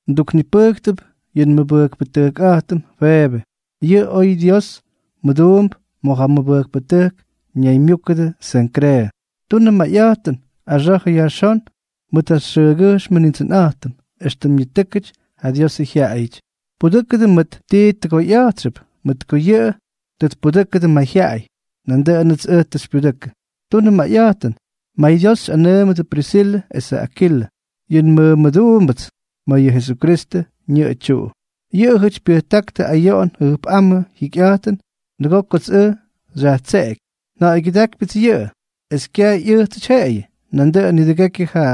Nduknipʉjktʉp yʉ nmʉmʉbʉjkpʉꞌa̱jtʉm Febe. Yʉꞌʉ oy Dios mʉduump ma̱ ja mʉbʉjkpʉtʉjk ñaymyúkʉdʉ Senkreeʉ. Tunʉ mayꞌa̱jtʉn, axa̱jʉ yajxón mʉt ja xyʉʉgyʉjxmʉ Nindsʉnꞌa̱jtʉm, éxtʉm ñitʉ́kʉty ja Diosʉ jyaꞌayʉty. Pudʉ́kʉdʉ mʉt ti tʉgoyꞌa̱jtxʉp, mʉt ko yʉꞌʉ tʉ tpudʉ́kʉdʉ mayjyaꞌay, nandʉꞌʉnʉts ʉj tʉ xypyudʉkʉ. Tunʉ mayꞌa̱jtʉn mayDios xyꞌanʉʉmʉdʉ Prisilʉ esʉ Akilʉ, yʉ nmʉmʉduumbʉdyʉts ma̱ yʉ Jesukristʉ ñʉꞌʉ tyuꞌu. Yʉꞌʉjʉty pyʉjtáktʉ ayoꞌon jʉjpꞌámʉ jikyꞌa̱jtʉn nʉgoo kots ʉj xyajtseꞌeky. Nja̱ꞌa̱ygyʉdákypyʉts yʉꞌʉ, es kyaj ꞌyʉjtsʉty jeꞌeyʉ, nandʉꞌʉn nidʉgekyʉ ja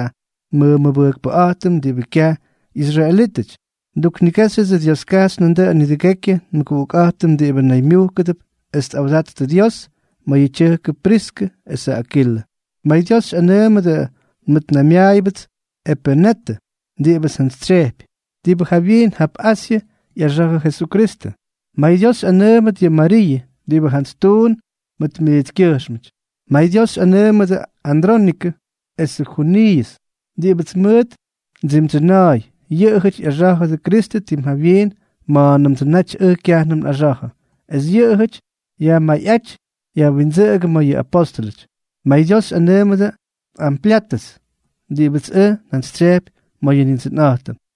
nmʉmʉbʉjkpʉꞌa̱jtʉm diꞌibʉ kyaj ꞌyisraelítʉty. Nduknigéxyʉdsʉ Dioskajxy nandʉꞌʉn nidʉgekyʉ nmʉguꞌukꞌa̱jtʉm diꞌibʉ naymyujkʉdʉp es tꞌawdattʉ Dios ma̱ yʉ tyʉjkʉ Priskʉ esʉ Akilʉ. MayDios xyꞌanʉʉmʉdʉ nmʉtnaymyaayʉbʉts Epenetʉ diꞌibʉts njantsytsyejpy, diꞌibʉ jawyiin jap Asyʉ ꞌyaxa̱jʉ Jesukristʉ. MayDios xyꞌanʉʉmʉdʉt yʉ Mariiʉ, diꞌibʉ jantsy tuun mʉt miitskyʉjxmʉty. MayDios xyꞌanʉʉmʉdʉ Andrónikʉ esʉ Juniiʉs, diꞌibʉts mʉʉt ndsimdsyʉna̱a̱y, yʉꞌʉjʉty ꞌyaxá̱jʉdʉ Kristʉ tim jawyiin ma̱a̱nʉmtsʉ naty ʉj kyajnʉm nꞌaxa̱jʉ; es yʉꞌʉjʉty yajmayꞌáty yajwindsʉꞌʉgʉ ma̱ yʉ apóstʉlʉty. MayDios xyꞌanʉʉmʉdʉ Amplyatʉs, diꞌibʉts ʉj njantsytsyejpy ma̱ yʉ Nindsʉnꞌa̱jtʉm.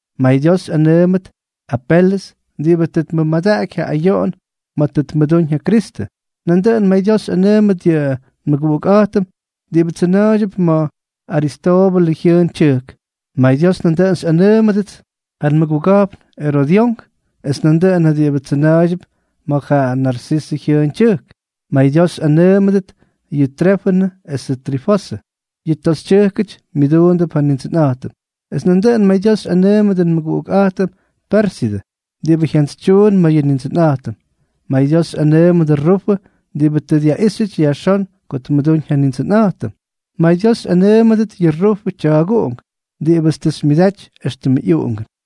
MayDios xyꞌanʉʉmʉdʉ Apelʉs, diꞌibʉ tʉ tmʉmadaꞌaky ja ayoꞌon ma̱ tʉ tmʉdúñ ja Kristʉ. Nandʉꞌʉn mayDios xyꞌanʉʉmʉdʉt yʉ nmʉguꞌukꞌa̱jtʉm diꞌibáty tsyʉna̱a̱ydyʉp ma̱ Aristoobʉlʉ jyʉʉn tyʉjk. MayDios xyꞌanʉʉmʉdʉts ja nmʉguga̱jpn Erodyón, es nandʉꞌʉn ja diꞌibʉ tsyʉna̱a̱ydyʉp ma̱ ja Narsisʉ jyʉʉn tyʉjk. MayDios xyꞌanʉʉmʉdʉt yʉ Trifenʉ esʉ Trifosʉ, yʉ toxytyʉjkʉty myʉduundʉp ja Nindsʉnꞌa̱jtʉm. Es nandʉꞌʉn mayDios xyꞌanʉʉmʉdʉ nmʉguꞌukꞌa̱jtʉm Pérsidʉ, diꞌibʉ jantsytyuun ma̱ yʉ Nindsʉnꞌa̱jtʉm. MayDios xyꞌanʉʉmʉdʉ Rufʉ, diꞌibʉ tʉ dyaꞌíxyʉty yajxón ko tmʉdúñ ja Nindsʉnꞌa̱jtʉm. MayDios xyꞌanʉʉmʉdʉt yʉ Rufʉ tya̱a̱guꞌunk, diꞌibʉts tʉ xymyʉdaty éxtʉmʉ ꞌyuꞌungʉn.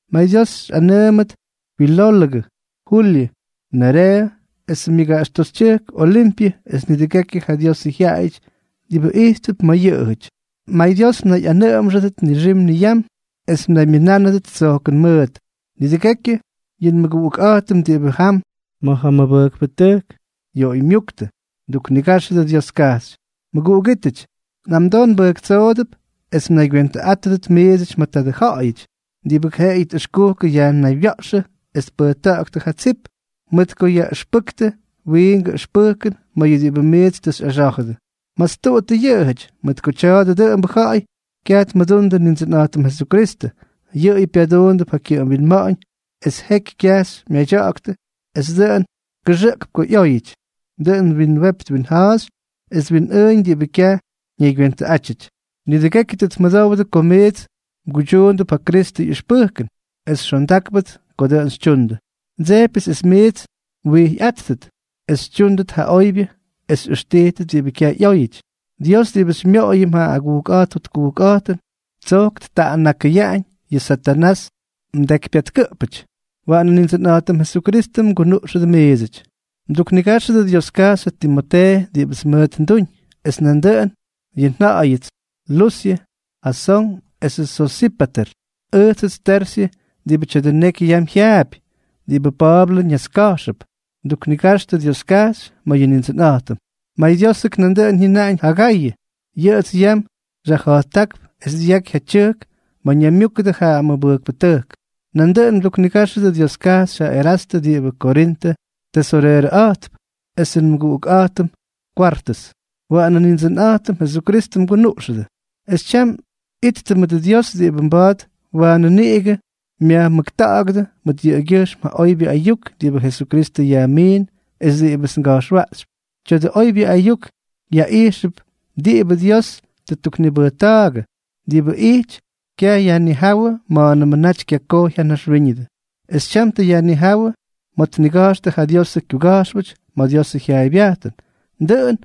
MayDios xyꞌanʉʉmʉdʉ Filólʉgʉ, Julyʉ, Nereeʉ esʉ myʉgaꞌax toxytyʉjk, Olimpyʉ es nidʉgekyʉ ja Diosʉ jyaꞌayʉty diꞌibʉ ijttʉp mʉt yʉꞌʉjʉty. MayDios mnayꞌanʉꞌʉmxʉdʉt nixim niyam es mnaymyʉnánʉdʉt tsojkʉn mʉʉt. Nidʉgekyʉ yʉ nmʉguꞌukꞌa̱jtʉm diꞌibʉ yam ma̱ ja mʉbʉjkpʉtʉjk yoꞌoymyúktʉ, mduknigáxʉdʉ Dioskajxy. Mʉguꞌugítʉty, nꞌamdoo nbʉjktsoodʉp es mnaygywentʉꞌátʉdʉt miidsʉty ma̱ tadʉ ja̱ꞌa̱yʉty diꞌibʉ jeꞌeyʉ tꞌʉxkukʉ yajnaywya̱ꞌxʉ es tpʉjta̱ꞌa̱ktʉ ja tsip, mʉt ko yaꞌʉxpʉktʉ wiingʉ ʉxpʉjkʉn ma̱ yʉ diꞌibʉ miits tʉ xyꞌaxá̱jʉdʉ. Mastuꞌuttʉ yʉꞌʉjʉty, mʉt ko tya̱a̱dʉ dʉꞌʉmbʉ ja̱ꞌa̱y kyaj tmʉdundʉ Nindsʉnꞌa̱jtʉm Jesukristʉ, yʉꞌʉyʉ pyaduundʉp ja kyʉꞌʉm winma̱ꞌa̱ñ es jeky kya̱jx myadya̱ꞌa̱ktʉ es dʉꞌʉn kʉxʉꞌkp ko ꞌyóyʉty, dʉꞌʉn twinwepy twinja̱a̱xy es twinꞌʉʉñ diꞌibʉ kyaj ñaygywentʉꞌátyʉty. Nidʉgekyʉ tʉ tmʉdowdʉ ko miits mguydyuundʉp ja Kristʉ ꞌyʉxpʉjkʉn, es xondákpʉts ko dʉꞌʉn xytyundʉ. Ndsejpyʉts es miits mwijyꞌáttʉt es xytyúndʉt ja oybyʉ es xyꞌʉxtijtʉt diꞌibʉ kyaj ꞌyóyʉty. Dios diꞌibʉ xymyoꞌoyʉm ja agujkꞌa̱jt jotkujkꞌa̱jtʉn, tsojk ttaꞌannakʉyaꞌañ yʉ Satanás mdekypyatkʉꞌpʉty. Waꞌanʉ Nindsʉnꞌa̱jtʉm Jesukristʉ mgunuꞌxʉdʉ miidsʉty. Mduknigáxʉdʉ Dioskajxy ja Timotee, diꞌibʉts mʉt nduñ, es nandʉꞌʉn yʉ nja̱ꞌa̱yʉts, ja Lusyʉ, Jasón esʉ Sosípater. Ʉjtsʉts Tersyʉ, diꞌibʉ tya̱dʉ neky yam jyaapy diꞌibʉ Pa̱a̱blʉ ñaska̱jxʉp, nduknigaxtʉ Dioskajxy ma̱ yʉ Nindsʉnꞌa̱jtʉm. MayDiósʉk dʉꞌʉn jyʉnaꞌañ ja Gayʉ. Yʉꞌʉts yam xyajja̱jttákp es dyaky ja tyʉjk ma̱ ñaymyúkʉdʉ ja mʉbʉjkpʉtʉjk. Nandʉꞌʉn mduknigáxʉdʉ Dioskajxy ja Erastʉ diꞌibʉ Korintʉ tesoreerʉꞌa̱jtp, esʉ nmʉguꞌukꞌa̱jtʉm Kwartʉs. Waꞌanʉ Nindsʉnꞌa̱jtʉm Jesukristʉ mgunuꞌxʉdʉ. Es tyam, ittʉ mʉdʉ Dios diꞌibʉ mba̱a̱t waanʉ niꞌigʉ myajmʉkta̱ꞌa̱gʉdʉ mʉt yʉꞌʉgyʉjxm ja oybyʉ ayuk diꞌibʉ Jesukristʉ yajmiin es diꞌibʉts nga̱jxwaꞌxypy. Tya̱dʉ oybyʉ ayuk yaꞌijxʉp diꞌibʉ Dios tʉ ttuknibʉjta̱a̱gʉ, diꞌibʉ ijty kyayajnijáwʉ ma̱a̱nʉmʉ naty kyakojy ja naxwíñʉdʉ, es tyam tʉ yajnijáwʉ ma̱ tniga̱jxtʉ ja Diosʉ kyuga̱jxpʉty ma̱ Diosʉ jyaaybyajtʉn, dʉꞌʉn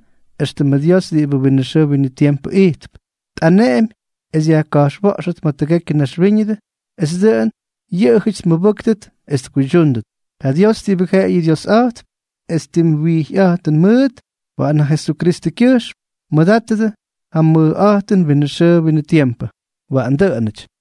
éxtʉmʉ Dios diꞌibʉ winʉ xʉʉ winʉ tiempʉ ijtp, tꞌaneꞌemy es yajka̱jxwa̱ꞌxʉt ma̱ tʉgekyʉ naxwíñʉdʉ es dʉꞌʉn yʉꞌʉjʉty tmʉbʉ́ktʉt es tkuydyúndʉt. Ja Dios diꞌibʉ jeꞌeyʉ Diosꞌa̱jtp es tim wyijyꞌa̱jtʉn mʉʉt, waꞌan jaꞌa Jesukristʉkyʉjxm tmʉdátʉt ja mʉjꞌa̱jtʉn winʉ xʉʉ winʉ tiempʉ. Waꞌan dʉꞌʉnʉty.